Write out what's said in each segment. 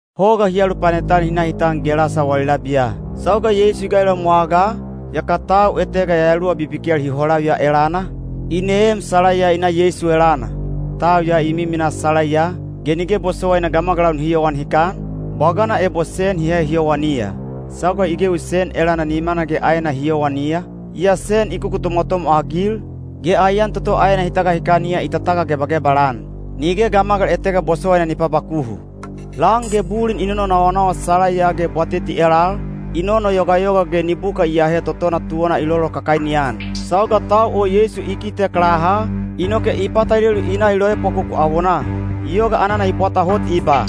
Hoga hi alupanet-an hi na hi tan Gelasa wali labiya. Sauga Yeisu i gailoem wagaa, yaka tau etega yayaluwa bibikel hi holaviya elana, i neem salaiya i na Yeisu elana. Tau ya i miminaa salaiya, ge nige bosowaina gamagalau nihi yowan hikan, bwagana ebo sen hi ahe hi yowaniya. Sauga i gewi sen elana nimana ge aena hi yowaniya, yaa sen i kukutomwatomwa-agil, ge aiyan toto aena hi tagahikaniya i tatagagebagebal-an. Nige gamagal etega bosowaina ni pabakuhu. Lan ge bulin i nononawanawa salaiya ge bwateti elal, i nonoyogayoga ge nibuka i aahe totona tuwana i lolokakaini-an. Sauga tau o Yeisu i kitek laha, inoke i patalelu i na i loepwakoku awonaa. I yoga anana i bwata hot i ba,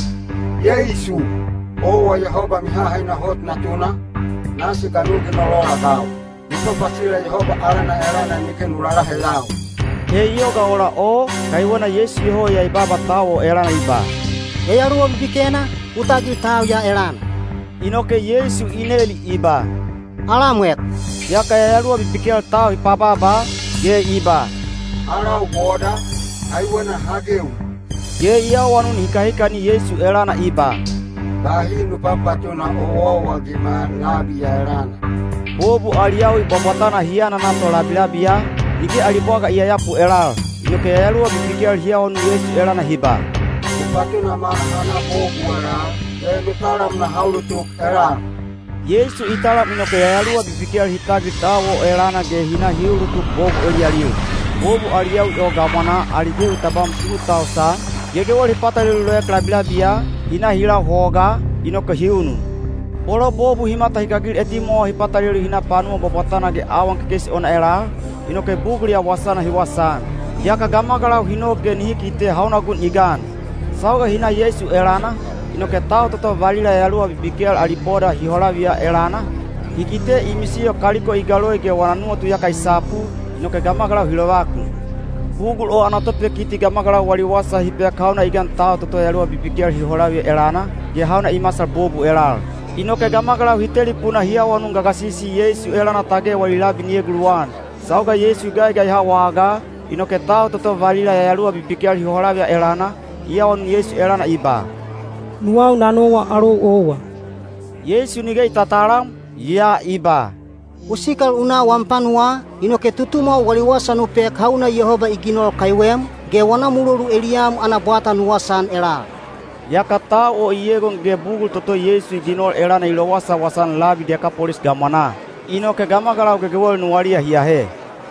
“Yeisu, owa Yehoba Mihahaina Hot Natuna, nasi ga nu ginol ola-agau? Nu papasila Yehoba alana elana nige nu lalaheyau!” He i yoga ola o, kaiwena Yeisu iyoho ya i baaba tau o elana i ba, “Yayaluwa bibikena, u tagil tau ya elana!” Inoke Yeisu i neli i ba, “Alamwek?” Yaka yayaluwa bibikel tau hi pabaaba, ge i ba, “Alau Boda, kaiwena ha gewi.” Ge i awanun hikahikani Yeisu elana i ba, “Bahi nu papatuna owaowa-agima labi ya elana.” Bobu ali yawi bwabwatana hi anana to labilabiya, nige ali bwaga i yayapu elal. Inoke yayaluwa bibikel hi awanun Yeisu elana hi ba, “U patunama naha na bobu elal, ge nu talam naha ulutuk elal.” Yeisu i talam inoke yayaluwa bibikel hi tagil tau o elana ge hi na hi ulutuk bobu eliyalil. Bobu ali yawi o gamwanaa ali gewi tabam tu tausan, gegewel hi patalelu loek labilabiya, hi na hi lau hogaa, inoke hi unun. Bolo bobu hi matahikagil etimwawa hi patalelu hi na panuwa bwabwatana ge awan kekeisi ona elal, inoke bugul ya wasana hi wasaan. Yaka gamagalau hi nok ge nihi kite hauna gun i gan. Sauga hi na Yeisu elana, inoke tau toto valila yayaluwa bibikel ali boda hi holaviya elana, hi kite i misiyo kaliko i galoi ge wana nuwatu iyaka i sapu, inoke gamagalau hi lovakun. Bugul o ana topekiti gamagalau wali wasa hi pek hauna i gan tau toto yayaluwa bibikel hi holaviya elana, ge hauna i masal bobu elal. Inoke gamagalau hi telipuna hi awanun gagasisi Yeisu elana tage wali labi ni eguluwan. Sauga Yeisu i gaigaiha wagaa, inoke tau toto valila yayaluwa bibikel hi holaviya elana, i awanun Yeisu elana i ba, “Nuwau na nowa alou owa.” Yeisu nige i tatalam, yaa i ba, “U sikal u na wam panuwaa, inoke tutumwau wali wasa nu pek hauna Yehoba i ginol kaiwem, ge wana mulolu eliyam ana bwata nu wasaan elal.” Yaka tau o i egon ge bugul toto Yeisu i ginol elana i lowasawasa-an labi Dekapolis gamwanaa. Inoke gamagalau gegewel nuwaliya hi ahe.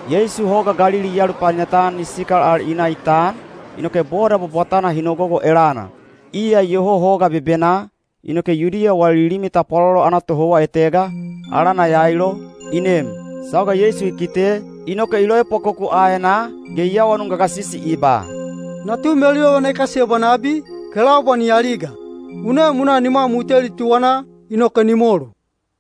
Yeisu Hoga Galili i alupanet-an i sikal al i na i tan, inoke boda bwabwatana hi nogogo elana. Iya iyoho hoga bebenaa, inoke Yudiya wali limi tapwalolo ana tohouwa etega, alana Yailo, i nem. Sauga Yeisu i kite, inoke i loepwakoku aenaa, ge i awanun gagasisi i ba, “Natu meluyovana i kasiyebwa nabi, kelaubwa ni aliga. U nem u na nimwam u teli tuwanaa, inoke ni molu.”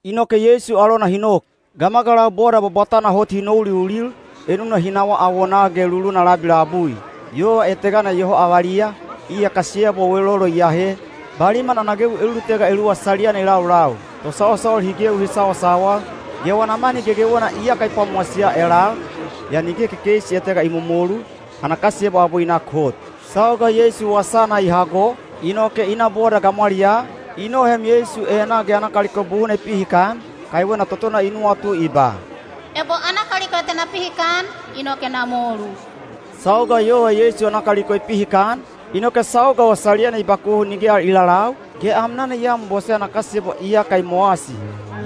Inoke Yeisu alona hi nok. Gamagalau boda bwabwatana hot hi nouliulil, enuna hi nawaa awonaa ge luluna labi labui. Yova etegana iyoho avaliya, iya kasiyebwa welolo i ahe, baliman ana gewi elulutega eluwa saliyana i laulau. Tosawasawal hi gewi hi sawasawal, ge wana mani gegewena iyaka i pwamowasiya elal, yaa nige kekeisi etega i momolu, ana kasiyebwa abwe i nak hot. Sauga Yeisu wasana i hago, inoke i na boda gamwaliyaa, i noheem Yeisu enaa ge ana kaliko buhuna i pihikan, kaiwena totona i nuwatu i ba, “Ebo ana kaliko ya te na pihikan, inoke na molu.” Sauga yova Yeisu ana kaliko i pihikan, inoke sauga o saliyana i bakuhu nige al i lalau, ge amnana i anbose ana kasiyebwa iyaka i mowasi.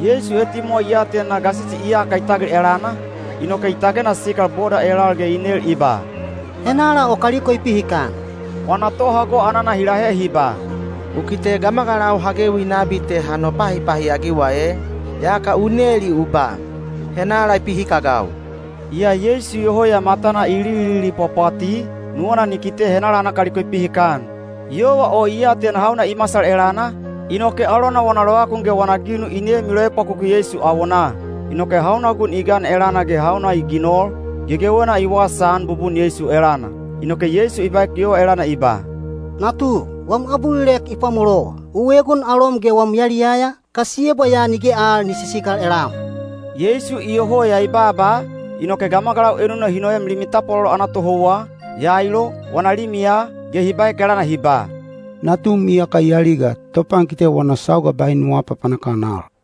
Yeisu etimwawa i atena gasisi iyaka i tagil elana, inoke i tagena sikal boda elal ge i nel i ba, “Henala o kaliko i pihikan?” Wana tohago anana hi lahe hi ba, “U kite gamagalau ha gewi nabi te ha nopahipahi-agiwa ee, yaka u neli u ba, ‘Henala i pihikagau?’” Yaa Yeisu iyoho ya matana i lililipwapwati, nuwana ni kite henala ana kaliko i pihikan. Yova o i atena hauna i masal elana, inoke alona wana lovakun ge wana ginu i nem i loepwakoku Yeisu awonaa. Inoke hauna gun i gan elana ge hauna i ginol, gegewena i wasaan bubun Yeisu elana. Inoke Yeisu i baek yova elana i ba, “Natu, wam abulilek i pwamolowa. U egon alom ge wam yaliyaya, kasiyebwa ya nige al ni sisikal elam.” Yeisu iyoho ya i baaba, inoke gamagalau enuna hi noem limi tapwalolo ana tohouwa, Yailo, wana limiya, ge hi baek elana hi ba, “Natum iyaka i aliga. Topankite wana sauga bahi nu aapapanak-an al.”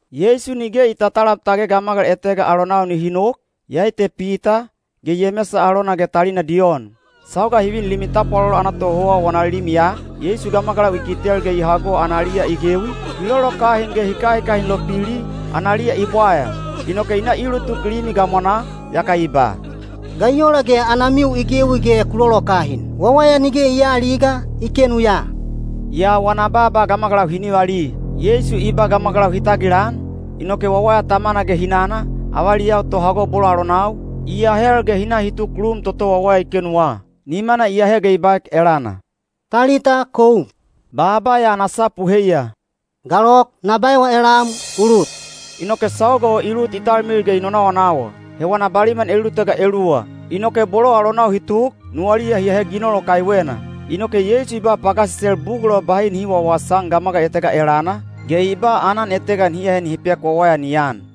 Yeisu nige i tatalam tage gamagal etega alonau nihi nok, iyai te Pita, ge Yemesa alona ge talina Diyon. Sauga hi vin limi tapwalolo ana tohouwa wana limiya, Yeisu gamagalau i kitel ge i hago analiya i gewi, hi lolokahin ge hi kahikahin lopili, analiya i bwaya. Inoke i na i ulutuk limi gamwanaa, yaka i ba, “Ga i ola ge anamiu i gewi ge ku lolokahin? Wawaya nige i aaliga, i kenu ya.” Yaa wana baaba gamagalau hi nivali. Yeisu i ba gamagalau hi tagilan, inoke wawaya tamana ge hinana, avaliyau tohago bolo alonau, i ahel ge hi na hi tuk lum toto wawaya i kenuwa. Nimana i ahe ge i baek elana, “Talita koum!” Baaba ya ana sapu heiya “Galok, na baewa elam, u lut!” Inoke sauga o i lut talmilil ge i nonawanawa. He wana baliman elulutega eluwa. Inoke bolo alonau hi tuk, nuwaliya hi ahe ginol o kaiwena. Inoke Yeisu i ba pagasisel bugul o bahi nihi wawasaan gamagal etega elana, ge i ba aanan etega nihi ahe nihi pek wawaya ni an.